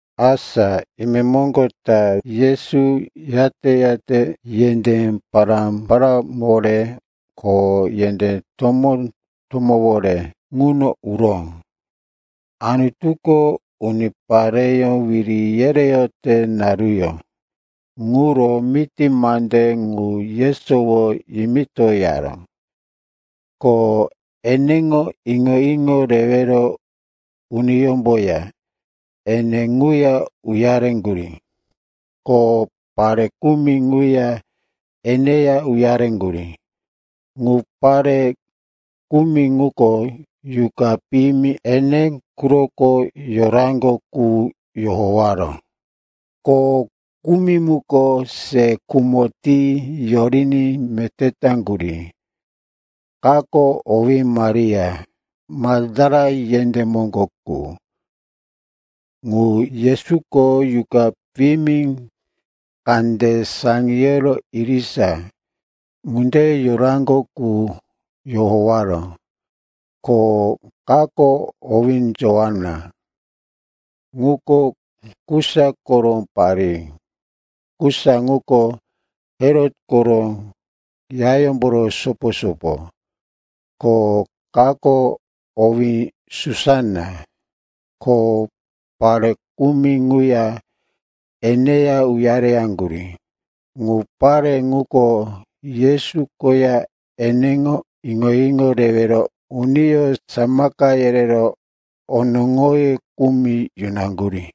Asa imemoŋgo ta Yesu yate-yate yendé pará-paráwore ko yendé tomó-tomówore ŋuno uro Anutuko unipareyó wiri yereyote naruyó ŋuro miti mande ŋu yesowo yimitoyaró. Ko eneŋo iŋo-iŋo rewero uniyómboya ene ŋuya uyareŋgurí. Ko pare kumi ŋuya eneya uyareyaŋgurí. Ŋu pare kumi ŋuko yuqa piyimi ene quroko yoraŋgo qu yohowaró, ko kumi ŋuko se khumo ti yoriní meté taŋgurí. Kako owí Maria, Maktala yendé moŋgo qu, ŋu Yesuko yuqa piyimi kande saŋiyoro irisa ŋunde yoraŋgo qu yohowaró. Ko kako owí Joana, ŋuko Kusa koro parí (Kusa ŋuko Herot koro yayómboro sopo-sopo), ko kako owí Susana, ko pare kumi ŋuya eneya uyareyaŋgurí. Ŋu pare ŋuko Yesu koya eneŋo iŋo-iŋo rewero uniyó samaka yerero onoŋoye kumi yunaŋgurí.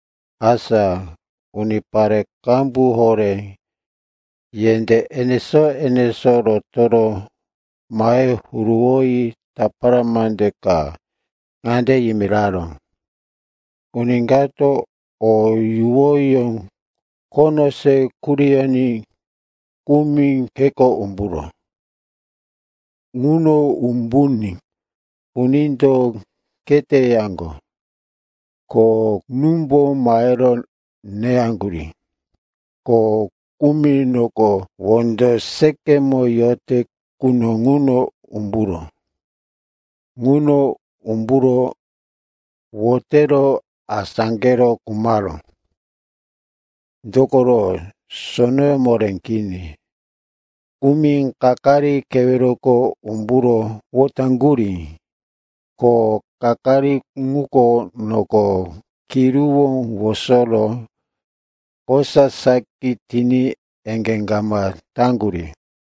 Asa unipare qambu horé yendé enesó-enesó rotoro mahe huruwoyi tapara mande ka ŋande yimiraró: “Uni kato o yuwoyó khono se kuriyoní kumi kheko umburó. Ŋuno umbuní unindo kheteyaŋgo, ko númbo mahero neyaŋgurí. Ko kumi noko wondo seqemo yote quno ŋuno umburó. Ŋuno umburo wotero asáqero khumaró. Dokoro sonoyó moré kini. Kumi kakari keweroko umburo wotaŋgurí, ko kakari ŋuko noko kiruwó wosoro kosa saki riní eŋgé kama taŋgurí.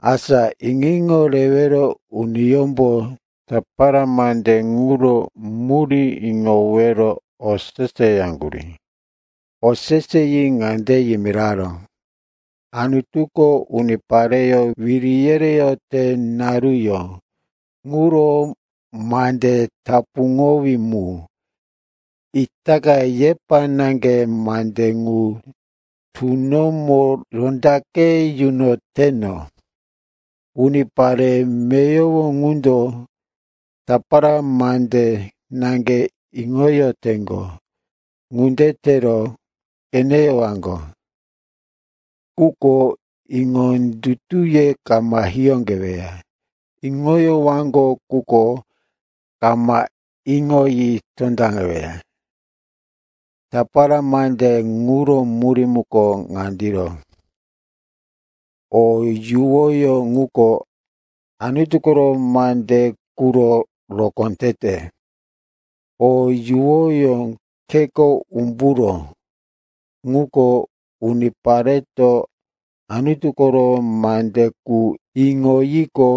Asa iŋo-iŋo rewero uniyómbo tapara mande ŋuro murí iŋowero oseseyaŋgurí. Oseseyi ŋande yimiraró, “Anutuko unipareyó wiri yereyote naruyó ŋuro mande tapuŋowí mu. Itaka yepa naŋge mande ŋu tunomo rondaqe yunoyoteno. Unipare meyowo ŋundo tapara mande naŋge iŋoyoteŋgo. Ŋunde tero “‘qeneyowaŋgo, quko iŋondutuye kama hiyóqeweya, iŋoyowaŋgo, quko kama iŋoyi tondaŋeweya.’ “Tapara mande ŋuro murí muko ŋandiro. O yuwoyó ŋuko Anutu koro mande quro rokó tete. O yuwoyó kheko umburó, ŋuko unipareto Anutu koro mande qu iŋoyiqo,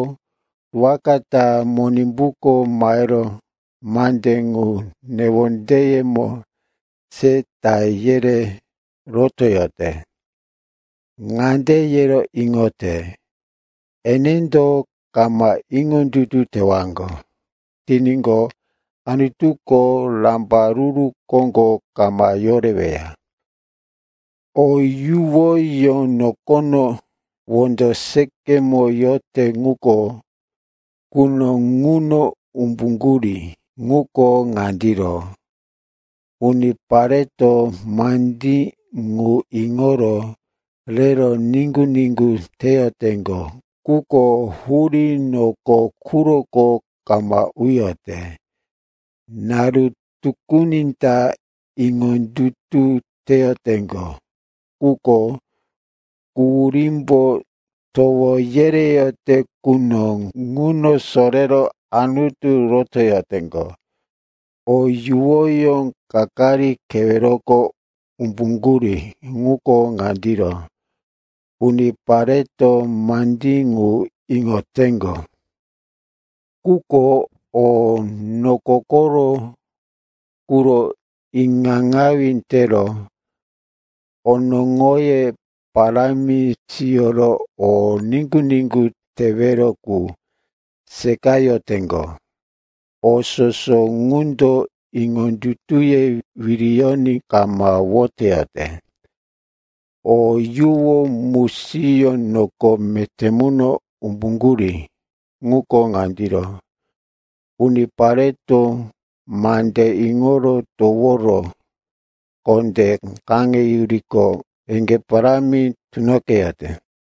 waka ta Monimbuko mahero mande ŋu newondeyemo se ta yere rotoyote. Ŋande yero iŋote, enendo kama iŋondutu tewaŋgo tiníqo, Anutuko rambaruru koŋgo kama yoreweya. O yuwoyó noko wondo seqemo yote quno ŋuno umbuŋgurí ŋuko ŋandiro: unipareto mandí ŋu iŋoro rero niŋgu-niŋgu teyoteŋgo, quko hurí noko quroko kama uyote. Naru tukuni ta iŋondutu teyoteŋgo, quko quhurímbo towo yereyote quno ŋuno sorero Anutu rotoyoteŋgo. O yuwoyó kakari keweroko umbuŋgurí ŋuko ŋandiro: unipareto mandí ŋu iŋoteŋgo. Quko o noko koro quro iŋaŋawí tero onoŋoye parámi siyoro o niŋgu-niŋgu tewero qu seqayoteŋgo. O soso ŋundo iŋondutuye wiriyoní kama woteyote. O yuwo musiyó noko meté muno umbuŋgurí ŋuko ŋandiro: unipareto mande iŋoro toworo kondé kaŋeyuriqo, eŋgé parámi tunoqeyote.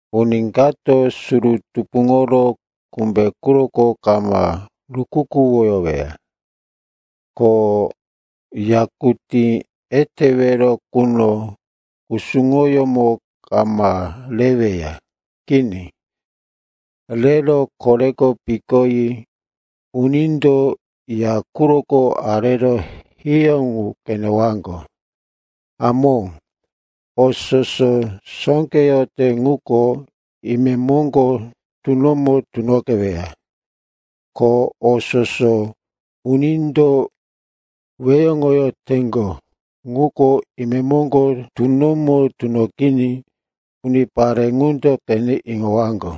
“Uni kato suru tupuŋoro kumbe quroko kama rukukuwoyoweya, ko yakutí etewero quro kusuŋoyómo kama reweya. Kini, rero koreko pikoyi unindo ya quroko arero hiyó ŋu qenewaŋgo. Hamó, o soso sóqeyote ŋuko imemoŋgo tunomo tunoqeweya. Ko o soso unindo weyoŋoyoteŋgo ŋuko imemoŋgo tunomo tunoqiní unipareto ŋu qene iŋowaŋgo.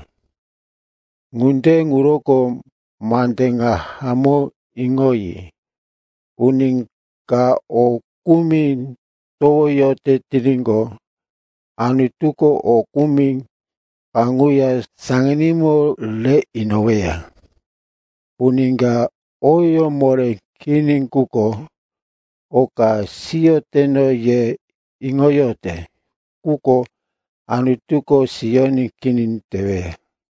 Ŋunde ŋuroko mande ŋa hamó iŋoyi. Uni ka o kumi towoyote tiníqo, Anutuko o kumi kaŋuya saŋanímo rero inoweya. Uni ka oyó moré kini quko, oka siyoteno, yero iŋoyote ŋuko Anutuko siyoní kini teweya.”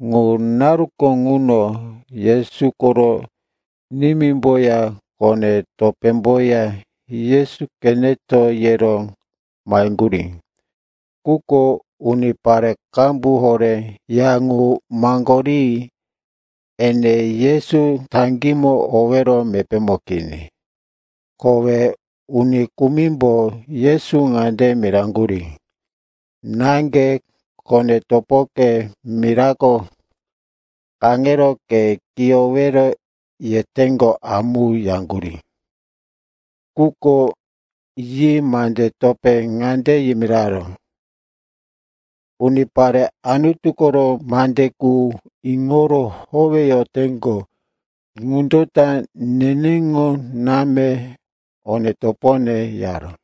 Ŋu naruko ŋuno Yesu koro nimímboya kone-topémboya, Yesu qeneto, yero maheŋgurí. Quko unipare qambu horé ya ŋu maŋgori ene Yesu taŋgímo owero mepémo kini. Kowe uni kumimbo Yesu ŋande miraŋgurí, “Náŋge, kone-topoke mirako kaŋero ke kiyowero yeteŋgo amu,” yaŋgurí. Quko yi mande topé ŋande yimiraró, “Unipare Anutu koro mande qu iŋoro howeyoteŋgo ŋundo ta neneŋo náme one-topone,” yaró.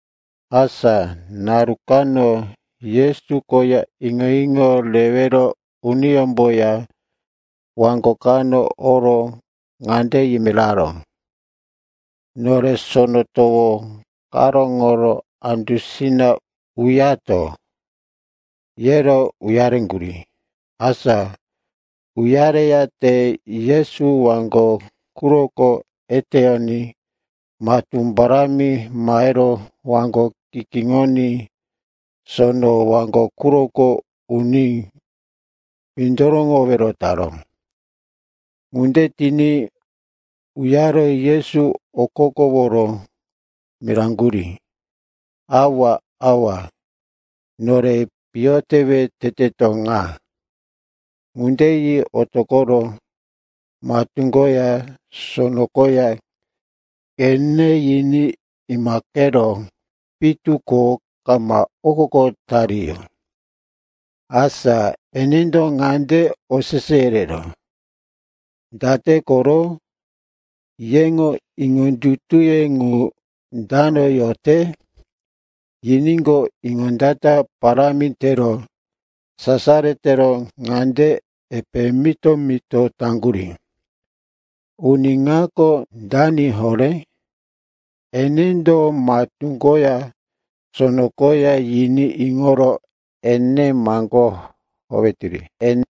Asa naru kano Yesu koya iŋo-iŋo rewero uniyómboya waŋgo kano oro ŋande yimiraró, “Nore sono towo karóŋoro andusina uyato.” Yero uyareŋgurí. Asa uyareyate Yesu waŋgo quroko eteyoní matú parámi mahero waŋgo kikíŋoní sono waŋgo quroko uní windoroŋowero taró. Ŋunde tiní uyaro Yesu okokoworo miraŋgurí, “Awa, awa, nore piyo tewe teteto ŋa!” Ŋunde yi otoqoro matú koya sono koya qene yiní imaqero pitu ko kama okoko tariyó. Asa enendo ŋande osese yereró, “Date koro? Yeŋo iŋondutuye ŋu dano yote?” Yiníqo, iŋondata parámi tero sasaro tero ŋande epe mito-mito taŋgurí, “Uni ŋako dani horé? Enendo matú koya sono koya yiní iŋoro ene maŋgó howetiri!”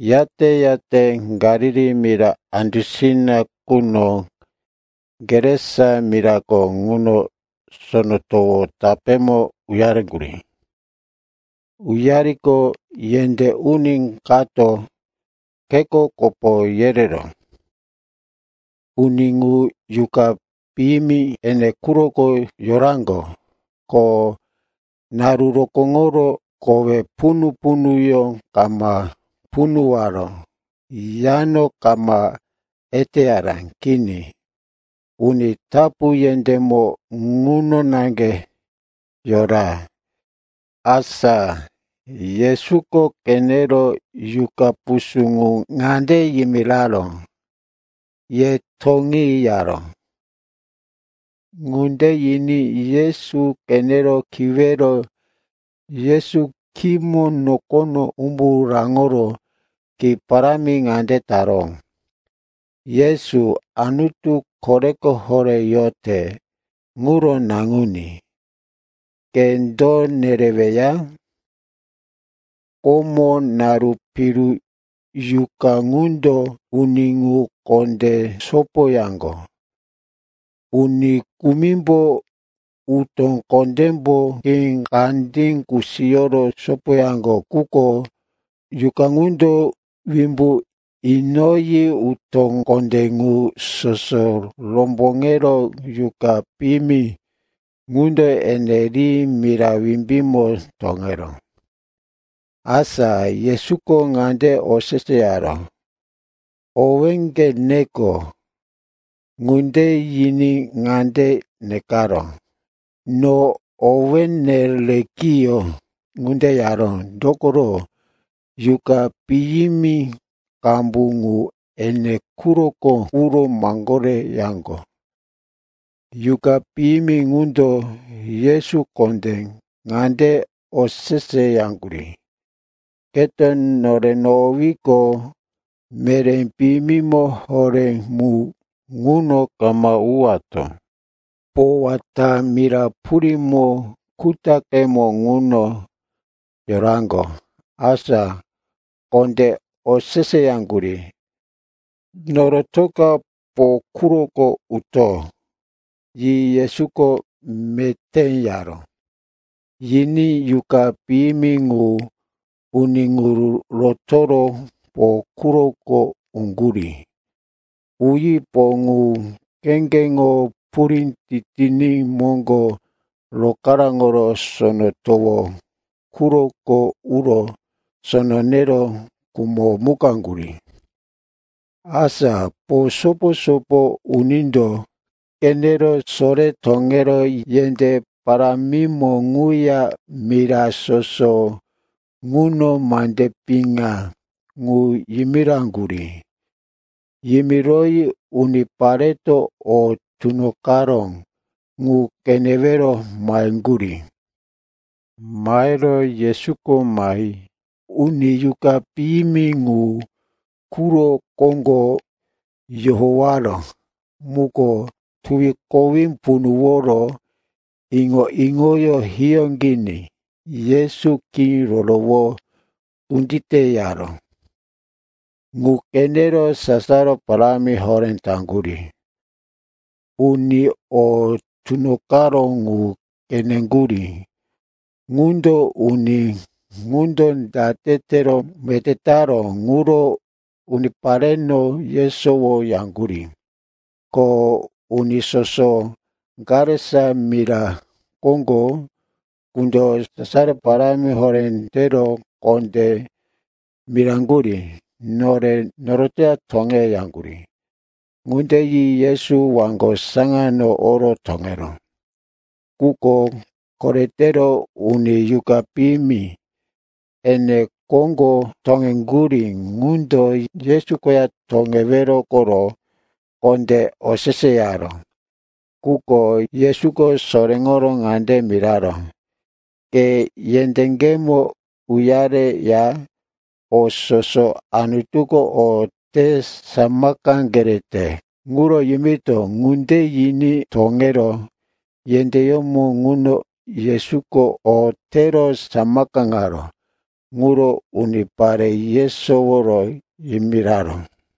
Yate-yate Galili mira andusina quno Gerasa mirako ŋuno sono towo tapémo uyareŋgurí. Uyariqo, yendé uni kato kheko kopo yereró. Uni ŋu yuqa piyimi ene quroko yoraŋgo, ko naru rokóŋoro kowe punu-punuyó kama punuwaró, yano kama eteyaró. Kini, uni tapu yendémo ŋuno naŋge yora. Asa Yesuko qenero yuqa pusú ŋu ŋande yimiraró, “Ye toŋi,” yaró. Ŋunde yiní Yesu qenero kiwero Yesu khímo nokono umbu raŋoro ki parámi ŋande taró, “Yesu, Anutu Koreko Horé yote ŋuro Naŋuní, ke do nereweya?” (Komo naru piru yuqa ŋundo uni ŋu kondé sopoyaŋgo. Uni kumimbo utó kondémbo khí kandí kusiyoro sopoyaŋgo, quko yuqa ŋundo wimbu inoyi utó kondé ŋu soso romboŋero yuqa piyimi ŋundo ene ri mira wimbímo toŋeró.) Asa Yesuko ŋande oseseyaró, “Owéŋge neko.” Ŋunde yiní ŋande nekaró, “No owéne Lekiyon.” Ŋunde yaró, dokoro yuqa piyimi qambu ŋu ene quroko uro maŋgoreyaŋgo. Yuqa piyimi ŋundo Yesu kondé ŋande oseseyaŋgurí, “Keto nore nohowiqo, meré piyimi horé mu ŋuno kama uwato.” Po wata mira purímo kutaqemo ŋuno yoraŋgo. Asa kondé oseseyaŋgurí, “Norotoka po quroko uto.” Yi Yesuko, “Meté,” yaró. Yiní yuqa piyimi ŋu uni ŋu rotoro po quroko uŋgurí. Uyi po ŋu kheŋgeŋo purí titiní moŋgo rokaráŋoro sono towo quroko uro sono nero khumomukaŋgurí. Asa po sopo-sopo unindo qenero sore toŋero yendé parámimo ŋuya mira soso ŋuno mande piŋa ŋu yimiraŋgurí. Yimiroyi unipareto o tunoqaró ŋu qenewero maheŋgurí. Mahero Yesuko mahi uni yuqa piyimi ŋu quro koŋgo yohowaró muko tuwi kowí punuworo iŋo-iŋoyó hiyóqiní Yesu khí rorowo kunditeyaró. Ŋu qenero sasaro parámi horé taŋgurí. Uni o tunoqaró ŋu qeneŋgurí ŋundo uni ŋundo date tero meté taró ŋuro unipareno yesowo yaŋgurí. Ko uni soso Gerasa mira koŋgo qundo sasaro parámi horé tero kondé miraŋgurí, nore noroto toŋe, yaŋgurí. Ŋunde yi Yesu waŋgo saŋano oro toŋeró. Quko koretero uni yuqa piyimi ene koŋgo toŋeŋgurí ŋundo Yesu koya toŋewero koro kondé oseseyaró. Quko Yesuko soréŋoro ŋande miraró, “Ke yendéŋgemo uyareya o soso Anutuko o te samaka kere ŋuro yimito.” Ŋunde yiní toŋero yendéyómo ŋuno Yesuko o tero samakaŋaró ŋuro unipare yesoworo yimiraró.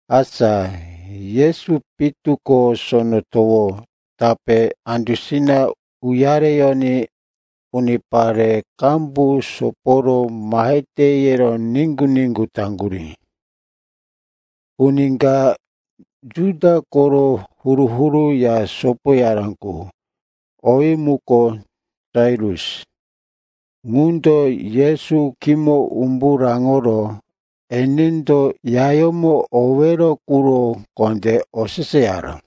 Asa Yesu pitu ko sono towo tapé andusina uyareyoní unipare qambu soporo, mahete, yero niŋgu-niŋgu taŋgurí. Uni ka Juda koro huru-huru ya sopoyara qu, owí muko Jairus, ŋundo Yesu khímo umbu raŋoro enendo yayómo owero quro kondé oseseyaró.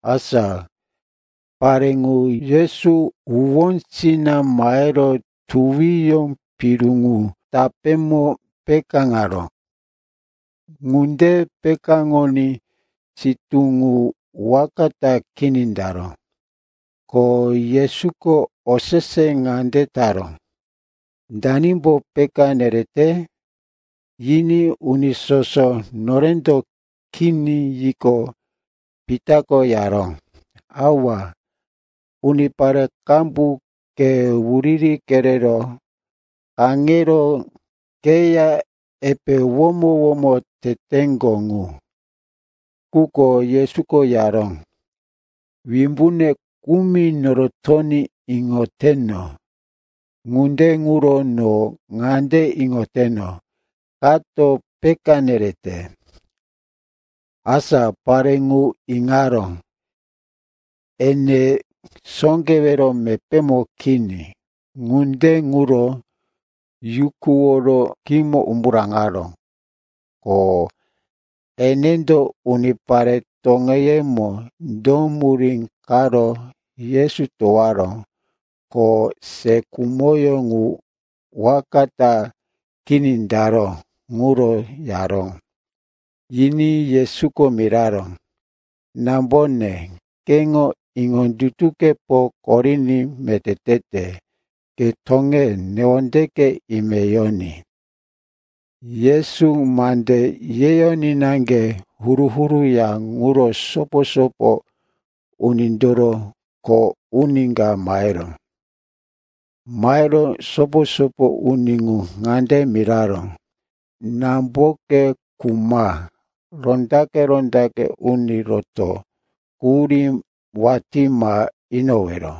Asa pare ŋu Yesu huwósina mahero tuwiyó piru ŋu tapémo pekáŋaró. Ŋunde pekáŋoní sitú ŋu waka ta kini taró. Ko Yesuko osese ŋande taró, “Danimbo peka nerete?” Yiní uni soso, norendo kini, yiqo, Pitako yaró, “Awa, unipare qambu ke wuriri kerero kaŋero keya epe womo-womo teteŋgo ŋu.” Quko Yesuko yaró, “Wimbune kumi norotoní iŋoteno, ŋunde ŋuro no ŋande iŋoteno, kato peka nerete.” Asa pare ŋu iŋaró, ene sóqewero mepémo kini. Ŋunde ŋuro yukuworo khímo umbu raŋaró. Ko enendo unipare toŋeyemo do murí karo Yesu towaró, ko se khumo ŋu waka ta kini taró, ŋuro yaró. Yiní Yesuko miraró, “Nambone, keŋo iŋondutukepo koriní meté tete. Ke toŋe, newondeke ime yoní.” Yesu mande yeyoní naŋge huru-huru ya ŋuro sopo-sopo unindoro kho uni ka maheró. Mahero sopo-sopo uni ŋu ŋande miraró, “Namboke khuma. Rondaqe-rondaqe uni roto quhurí watí ma inowero.”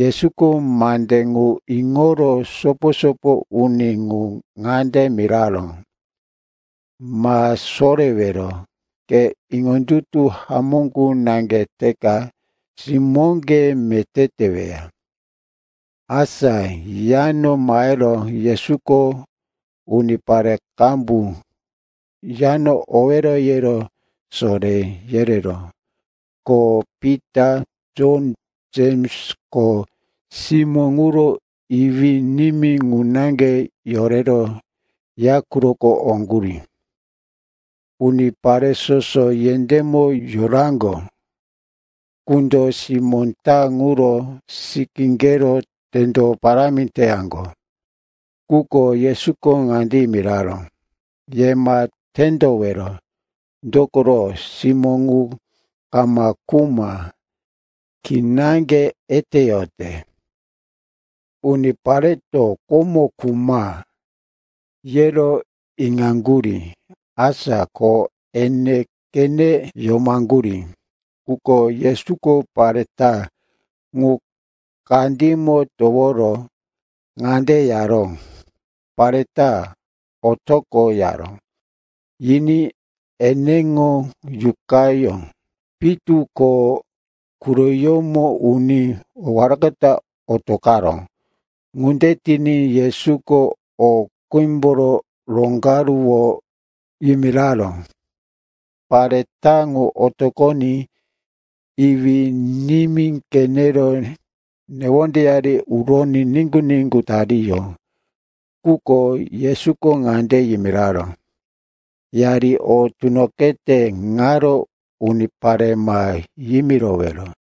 Yesuko mande ŋu iŋoro sopo-sopo uni ŋu ŋande miraró, “Ma sorewero. Ke iŋondutu hamó qu naŋge teka simóŋge meté teweya.” Asa yano mahero Yesuko unipare qambu yano owero yero soré yereró, ko Pita, Jon, Jems, ko simó ŋuro iwí-nimí ŋu naŋge yorero ya quroko oŋgurí. Unipare soso yendémo yoraŋgo qundo simó ta ŋuro sikíqero tendo parámi teyaŋgo. Quko Yesuko ŋande yimiraró, “Ye ma tendowero, dokoro simó ŋu kama khuma. Kinaŋge eteyote.” Unipareto, komo khuma, yero iŋaŋgurí, asa ko ene qene yomaŋgurí. Quko Yesuko pare ta ŋu kandímo toworo ŋande yaró, “Pare ta, otoqo,” yaró. Yiní eneŋo yuqayó pitu ko quroyómo uní waka ta otoqaró. Ŋunde tiní Yesuko, o qímboro roŋgaruwo, yimiraró. Pare ta ŋu otoqoní iwí-nimí qenero newondeyari uroní niŋgu-niŋgu tariyó. Quko Yesuko ŋande yimiraró, “Yari o tunoqete ŋaro unipare ma yimirowero.”